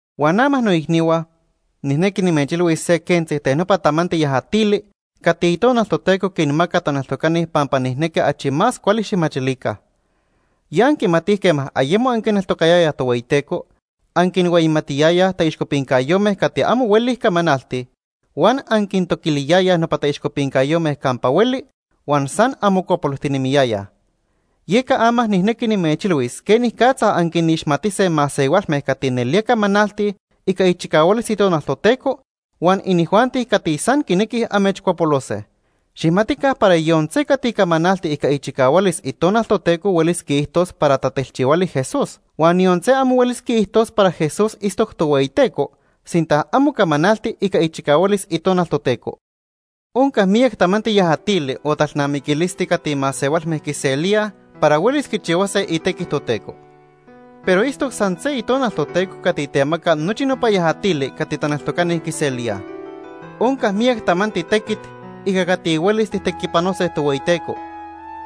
Huan ama noicnihua, nijnequi nimechilhuis se quentzi ten nopa tamanti yajatili cati Itonal Toteco quinmaca taneltocani pampa nijnequi achi más cuali xijmachilica. Ya anquimatij quema ayemo anquineltocayayaj Tohueyiteco, anquinhueyimatiyayaj taixcopincayome cati amo huelij camanaltij huan anquintoquiliyayaj nopa taixcopincayome campa hueli huan san anmocuapolojtinemiyayaj. Yeca ama nijnequi nimechilhuis quenicatza anquinixmatise masehualme cati nelía camanaltij ica ichicahualis Itonal Toteco huan inijuanti cati san quinequij amechcuapolose. Xijmatica para yon se cati camanalti ica ichicahualis Itonal Toteco huelis quiijtos para tatelchihuali Jesús. Huan yon se amo huelis quiijtos para Jesús itztoc Tohueyiteco sinta amo camanalti ica ichicahualis Itonal Toteco. Onca miyac tamanti yajatili o talnamiquilisti cati masehualme quiselíaj para huelis quichihuase itequi Toteco. Pero itztoc san se Itonal Toteco cati temaca nochi nopa yajatili cati taneltocani quiselíaj. Onca miyac tamanti tequit ica cati huelis tijtequipanose Tohueyiteco,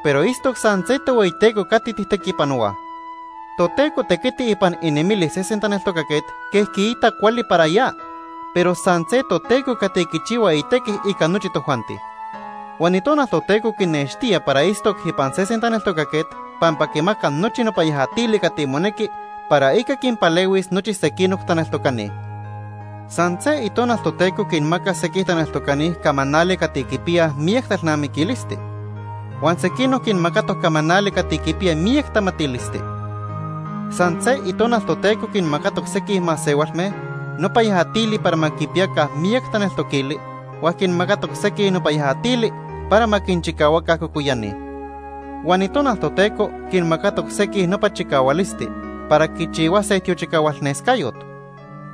pero itztoc san se Tohueyiteco cati tijtequipanohuaj. Toteco tequiti ipan inemilis sesen taneltocaquet quej quiita cuali para ya, pero san se Toteco cati quichihua itequi ica nochi tojuanti. Huan Itonal Toteco quinextía para itztoc ipan sesen taneltocaquet pampa quimaca nochi nopa yajatili cati monequi para ica quinpalehuis nochi sequinoc taneltocani. San se Itonal Toteco quinmaca sequij taneltocani camanali cati quipiyaj miyac talnamiquilisti, huan sequinoc quinmacatoc camanali cati quipiya miyac tamatilisti. San se Itonal Toteco quinmacatoc sequij masehualme nopa yajatili para ma quipiyaca miyac taneltoquili huan quinmacatoc sequij nopa yajatili para ma quinchicahuaca cocoyani. Huan Itonal Toteco quinmacatoc sequij nopa chicahualisti para quichihuase tiochicahualnescayot.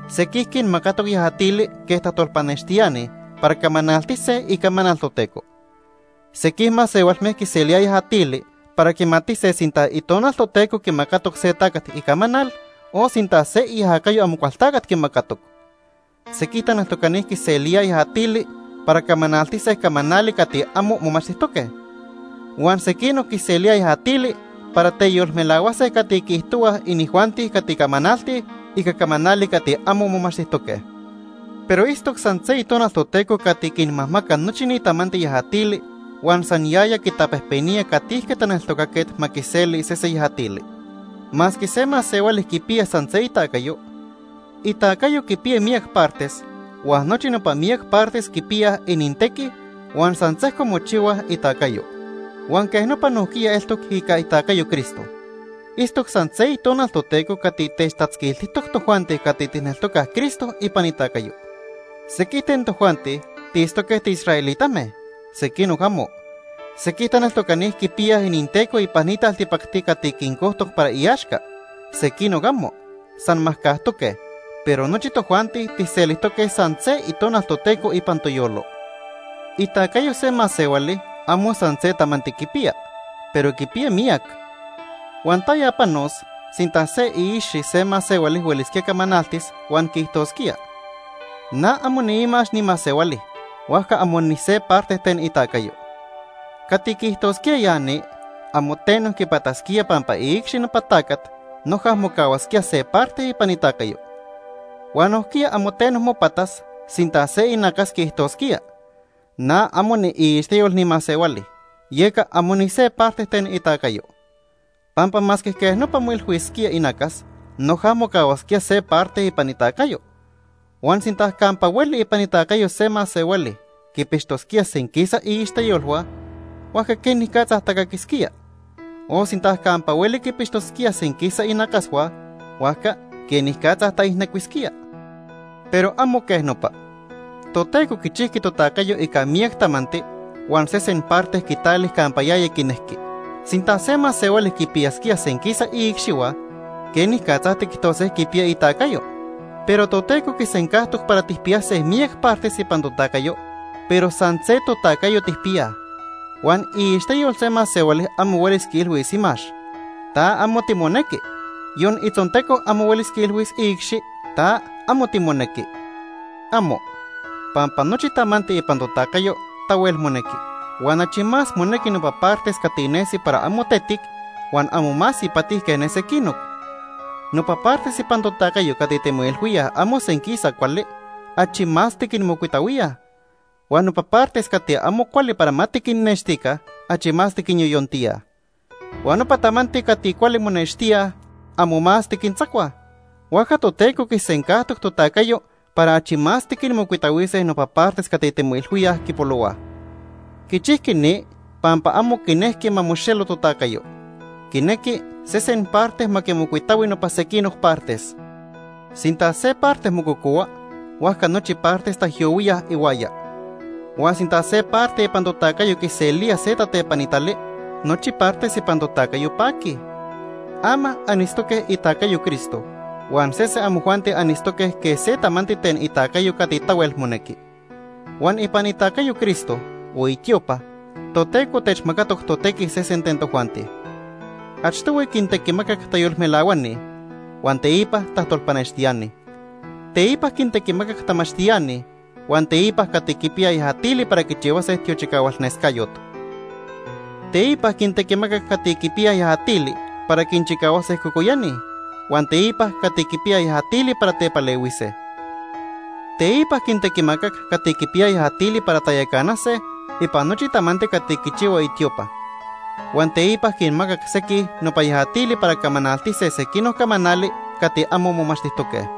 Sequij quinmacatoc yajatili quej tajtolpanextiani para camanaltise icamanal Toteco. Sequij masehualme quiselíaj yajatili para quimatise sinta Itonal Toteco quimacatoc se tacat icamanal o sinta se iajacayo Amocualtacat quimacatoc. Sequij taneltocani quiselíaj yajatili para camanaltise camanali cati amo momachtijtoque. Huan sequinoc quiselíaj yajatili para teyolmelahuase cati quiijtohuaj inijuanti cati camanaltij ica camanali cati amo momachtijtoque. Pero itztoc san se Itonal Toteco cati quinmajmaca nochi ni tamanti yajatili huan san yaya quitapejpenía catijque taneltocaquet ma quiseli sese yajatili. Masque se masehuali quipiya san se itacayo, itacayo quipiya miyac partes huan nochi nopa miyac partes quipiyaj inintequi huan san sejco mochihuaj itacayo. Huan quej nopa nojquiya eltoc ica itacayo Cristo. Itztoc san se Itonal Toteco cati techtatzquiltijtoc tojuanti cati tijneltocaj Cristo ipan itacayo. Sequij ten tojuanti tiitztoque tiisraelitame, sequinoc amo. Sequij taneltocani quipiyaj ininteco ipan ni taltipacti cati quincojtoc para iaxca, sequinoc amo, san majcajtoque, pero nochi tojuanti tijselijtoque san se Itonal Toteco ipan toyolo. Itacayo se masehuali amo san se tamanti quipiya, pero quipiya miyac. Huan ¿taya panos sinta se iicxi se masehuali huelisquía camanaltis huan quiijtosquía: “Na amo niimax ni masehuali, huajca amo nise parte ten itacayo”? Cati quiijtosquía ya ni amo teno quipatasquía pampa iicxi nopa tacat noja mocahuasquía se parte ipan itacayo. Huan nojquiya amo teno mopatas sinta se inacas quiijtosquía: “Na amo niiixteyol ni masehuali, yeca amo nise parte ten itacayo.” Pampa masque quej nopa moilhuisquía inacas, noja mocahuasquía se parte ipan itacayo. Huan sinta campa hueli ipan itacayo se masehuali quipixtosquía senquisa iixteyolhua, huajca ¿quenicatza tacaquisquía? O sinta campa hueli quipixtosquía senquisa inacashua, huajca ¿quenicatza taijnecuisquía? Pero amo quej nopa. Toteco quichijqui totacayo ica miyac tamanti huan sesen parte quitali campa yaya quinejqui. Sinta se masehuali quipiyasquía senquisa iicxihua, ¿quenicatza tiquijtose quipiya itacayo? Pero Toteco quisencajtoc para tijpiyase miyac partes ipan totacayo, pero san se totacayo tijpiyaj. Huan iixteyol se masehuali amo huelis quiilhuis imax: “Ta amo timonequi”, yon itzonteco amo huelis quiilhuis iicxi: “Ta amo timonequi”. ¡Amo! Pampa nochi tamanti ipan totacayo tahuel monequi, huan achi más monequi nopa partes cati nesi para amo tetic huan amo más ipati quej ne sequinoc. Nopa partes ipan totacayo cati timoilhuíaj amo senquisa cuali, achi más tiquinmocuitahuíaj. Huan nopa partes cati amo cuali para ma tiquinnextica, achi más tiquinyoyontíaj. Huan nopa tamanti cati cuali monextíaj, amo más tiquintzacuaj. Huajca Toteco quisencajtoc totacayo para achi más tiquinmocuitahuise nopa partes cati timoilhuíaj quipolohuaj. Quichijqui ni pampa amo quinejqui ma moxelo totacayo. Quinequi sesen parte ma quimocuitahui nopa sequinoc partes. Sinta se parte mococohua, huajca nochi partes taijyohuíaj ihuaya. Huan sinta se parte ipan totacayo quiselía se tatepanitali, nochi partes ipan totacayo paquij. Ama anitztoque itacayo Cristo huan sese amojuanti anitztoque quej se tamanti ten itacayo cati tahuel monequi. Huan ipan itacayo Cristo, o itiopa, Toteco techmacatoc totequi sesen ten tojuanti. Achtohui quintequimacac tayolmelahuani huan, teipa tajtolpanextiani. Teipa quintequimacac tamachtiani huan teipa cati quipiyaj yajatili para quichihuase tiochicahualnescayot. Teipa quintequimacac cati quipiyaj yajatili para quinchicahuase cocoyani, huan teipa cati quipiyaj yajatili para tepalehuise. Teipa quintequimacac cati quipiyaj yajatili para tayacanase ipan nochi tamanti cati quichihua itiopa. Huan teipa quinmacac sequij nopa yajatili para camanaltise sequinoc camanali cati amo momachtijtoque.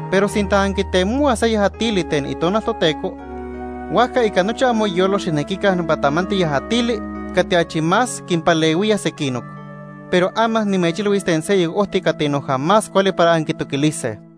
Pero sinta anquitemohuaj se yajatili ten Itonal Toteco, huajca ica nochi amoyolo xijnequica nopa tamanti yajatili cati achi más quinpalehuía sequinoc. Pero ama nimechilhuis ten seyoc ojti cati noja más cuali para anquitoquilise.